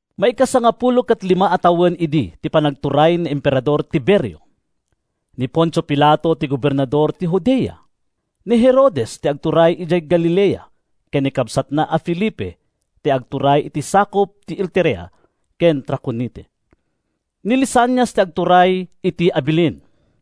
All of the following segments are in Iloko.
Maikasangapulo ket lima a tawen idi ti panagturay ni Emperador Tiberio. Ni Poncio Pilato ti gobernador ti Judea. Ni Herodes ti agturay idiay Galilea ket ni kabsatna a Felipe ti agturay iti sakup ti Iturea ken Traconite. Ni Lisanias ti agturay iti Abilene.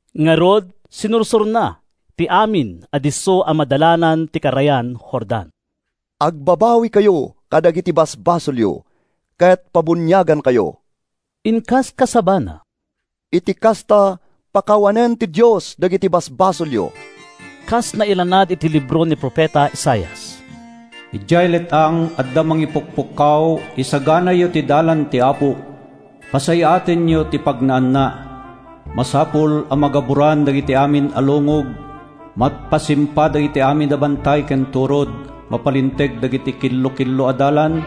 Ngarud, sinursorna ti amin a disso a madalanan ti karayan Jordan. “Agbabawikayo kadagiti basbasolyo, ket pabuniagankayo,” inkaskasabana. “Iti kasta, pakawanen ti Dios dagiti basbasolyo.” Kas nailanad iti libro ni profeta Isaias: “Idiay let-ang adda mangipukpukkaw: ‘Isaganayo ti dalan ti Apo, Pasayaatenyo ti pagnaanna! Masapul a magaburan dagiti amin a lungog, Mapasimpa dagiti amin a bantay ken turod, Mapalinteg dagiti killo-killo a dalan,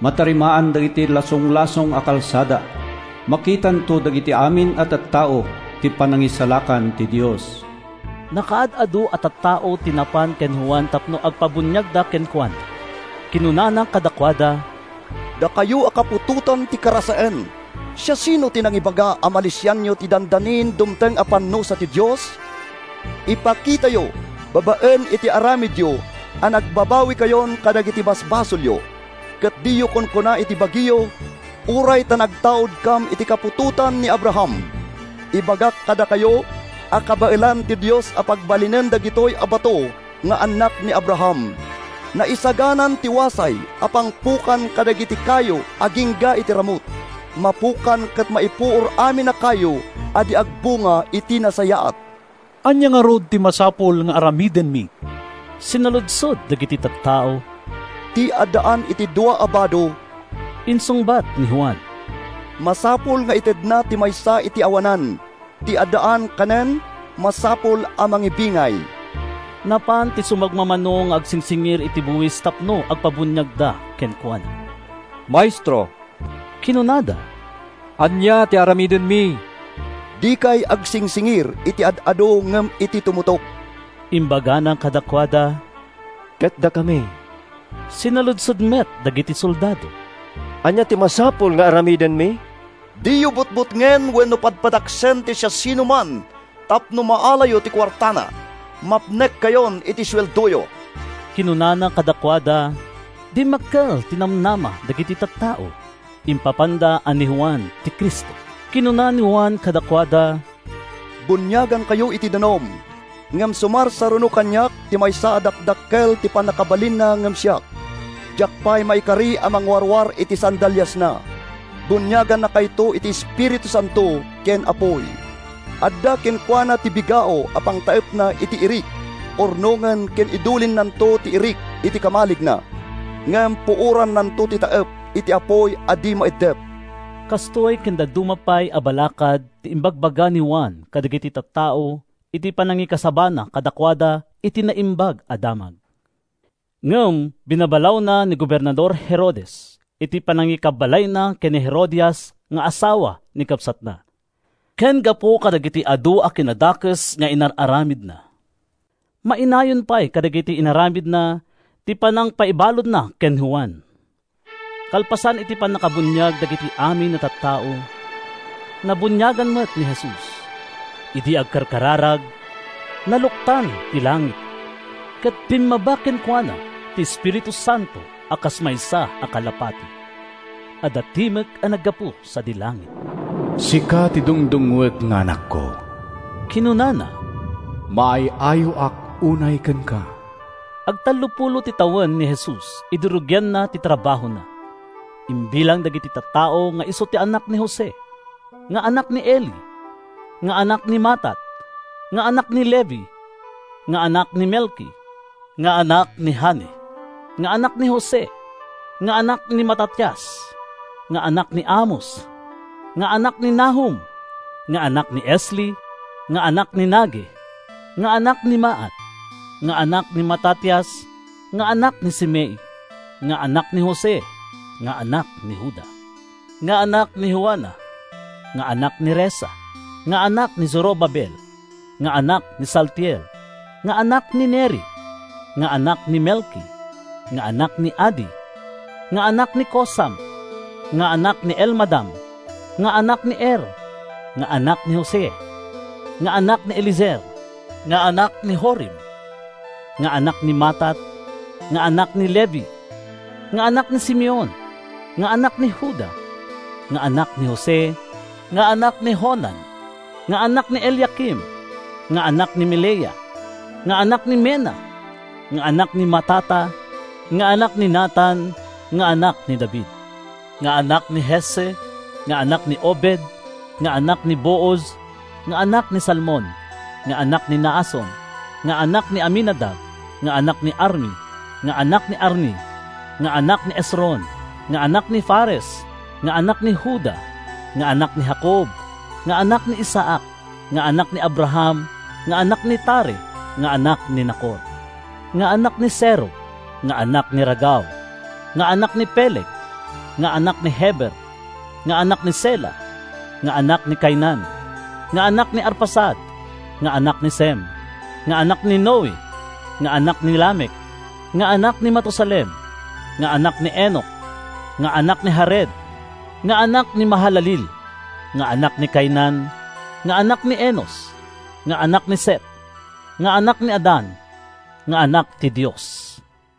Matarimaan dagiti lasonglasong a kalsada, Makitanto dagiti amin a tattao ti panangisalakan ti Dios!’” Nakaad-adu a tattao ti napan ken ni Juan tapno agpabuniagda kenkuana. Kinunana kadakuada, “Dakayo a kaputotan ti karasaen, siasino ti nangibaga a malisianyo ti dandanin dumteng a pannusa ti Dios? Ipakitayo babaen iti aramidyo a nagbabawikayon kadagiti basbasolyo. Ket diyo kunkuna iti bagiyo: ‘Uray ta nagtaudkam iti kaputotan ni Abraham!’ Ibagak kadakayo a kabaelan ti Dios a pagbalinen dagitoy a bato nga annak ni Abraham! Naisaganan ti wasay a pangpukan kadagiti kayo agingga iti ramut. Mapukan ket maipuor amin a kayo a di agbunga iti nasayaat.” “Ania ngarud ti masapul nga aramidenmi?” sinaludsod dagiti tattao. “Ti addaan iti dua a bado,” insungbat ni Juan, “masapul nga itedna ti maysa iti awanan. Ti addaan kanen, masapul a mangibingay.” Napan ti sumagmamano nga agsingsingir iti buis tapno agpabuniagda kenkuana. “Maestro,” kinunada, “ania ti aramidenmi?” “Dikay agsingsingir iti ad-adu ngem iti tumutop,” imbagana kadakuada. “Ket dakami,” sinaludsod met dagiti soldado, “ania ti masapul nga aramidenmi?” “Diyo butbutngen wenno padpadaksen ti siasinoman tapno maalayo ti kuartana. Mapnekkayon iti sueldoyo,” kinunana kadakuada. Dimmakkel ti namnama dagiti tattao. Impapanda a ni Juan ti Cristo. Kinuna ni Juan kadakuada: “Buniagankayo iti danum, ngem sumarsaruno kaniak ti maysa a dakdakkel ti pannakabalinna ngem siak. Diak pay maikari a mangwarwar iti sandaliasna. Buniagannakayto iti Espiritu Santo ken apuy. Adda kenkuana ti bigao a pangtaepna iti irik. Urnongen ken idulinnanto ti irik iti kamaligna. Ngem puorannanto ti taep iti apuy a di maiddep.” Kastoy ken dadduma pay a balakad ti imbagbaga ni Juan kadagiti tattao iti panangikasabana kadakuada iti Naimbag a Damag. Ngem binabalawna ni gobernador Herodes iti panangikabbalayna ken ni Herodias nga asawa ni kabsatna, ken gapu kadagiti adu a kinadakes nga inar-aramidna. Mainayon pay kadagiti inaramidna ti panangpaibaludna ken ni Juan. ni Jesus Kalpasan ti pannakabuniag dagiti amin a tattao, nabuniagan met ni Jesus. Idi agkarkararag, naluktan ti langit, ket bimmaba kenkuana ti Espiritu Santo a kas maysa a kalapati. Adda timek a naggapu sadi langit. “Sika ti dungdungngoek nga Anakko,” kinunana. “Maay-ayoak unay kenka.” Agtallopulo ti tawen ni Jesus idi rugianna ti trabahona. Imbilang dagiti tattao nga isu ti anak ni Jose, nga anak ni Eli, nga anak ni Matat, nga anak ni Levi, nga anak ni Melki, nga anak ni Jane, nga anak ni Jose, nga anak ni Matatias, nga anak ni Amos, nga anak ni Nahum, nga anak ni Esli, nga anak ni Nage, nga anak ni Maat, nga anak ni Matatias, nga anak ni Semei, nga anak ni Jose, nga anak ni Juda, nga anak ni Joana, nga anak ni Resa, nga anak ni Zorobabel, nga anak ni Sealtiel, nga anak ni Neri, nga anak ni Melki, nga anak ni Adi, nga anak ni Cosam, nga anak ni Elmadam, nga anak ni Er, nga anak ni Josue, nga anak ni Eliezer, nga anak ni Jorim, nga anak ni Matat, nga anak ni Levi, nga anak ni Simeon, nga anak ni Juda, nga anak ni Jose, nga anak ni Jonan, nga anak ni Eliakim, nga anak ni Melea, nga anak ni Mena, nga anak ni Matata, nga anak ni Natan, nga anak ni David, nga anak ni Jesse, nga anak ni Obed, nga anak ni Booz, nga anak ni Salmon, nga anak ni Naason, nga anak ni Aminadab, nga anak ni Armi, nga anak ni Arni, nga anak ni Esron, nga anak ni Fares, nga anak ni Juda, nga anak ni Jacob, nga anak ni Isaac, nga anak ni Abraham, nga anak ni Tare, nga anak ni Nacor, nga anak ni Serug, nga anak ni Ragau, nga anak ni Peleg, nga anak ni Heber, nga anak ni Selah, nga anak ni Cainan, nga anak ni Arfaxad, nga anak ni Sem, nga anak ni Noe, nga anak ni Lamec, nga anak ni Matusalem, nga anak ni Enoc, nga anak ni Jared, nga anak ni Mahalaleel, nga anak ni Cainan, nga anak ni Enos, nga anak ni Set, nga anak ni Adan, nga anak ti Dios.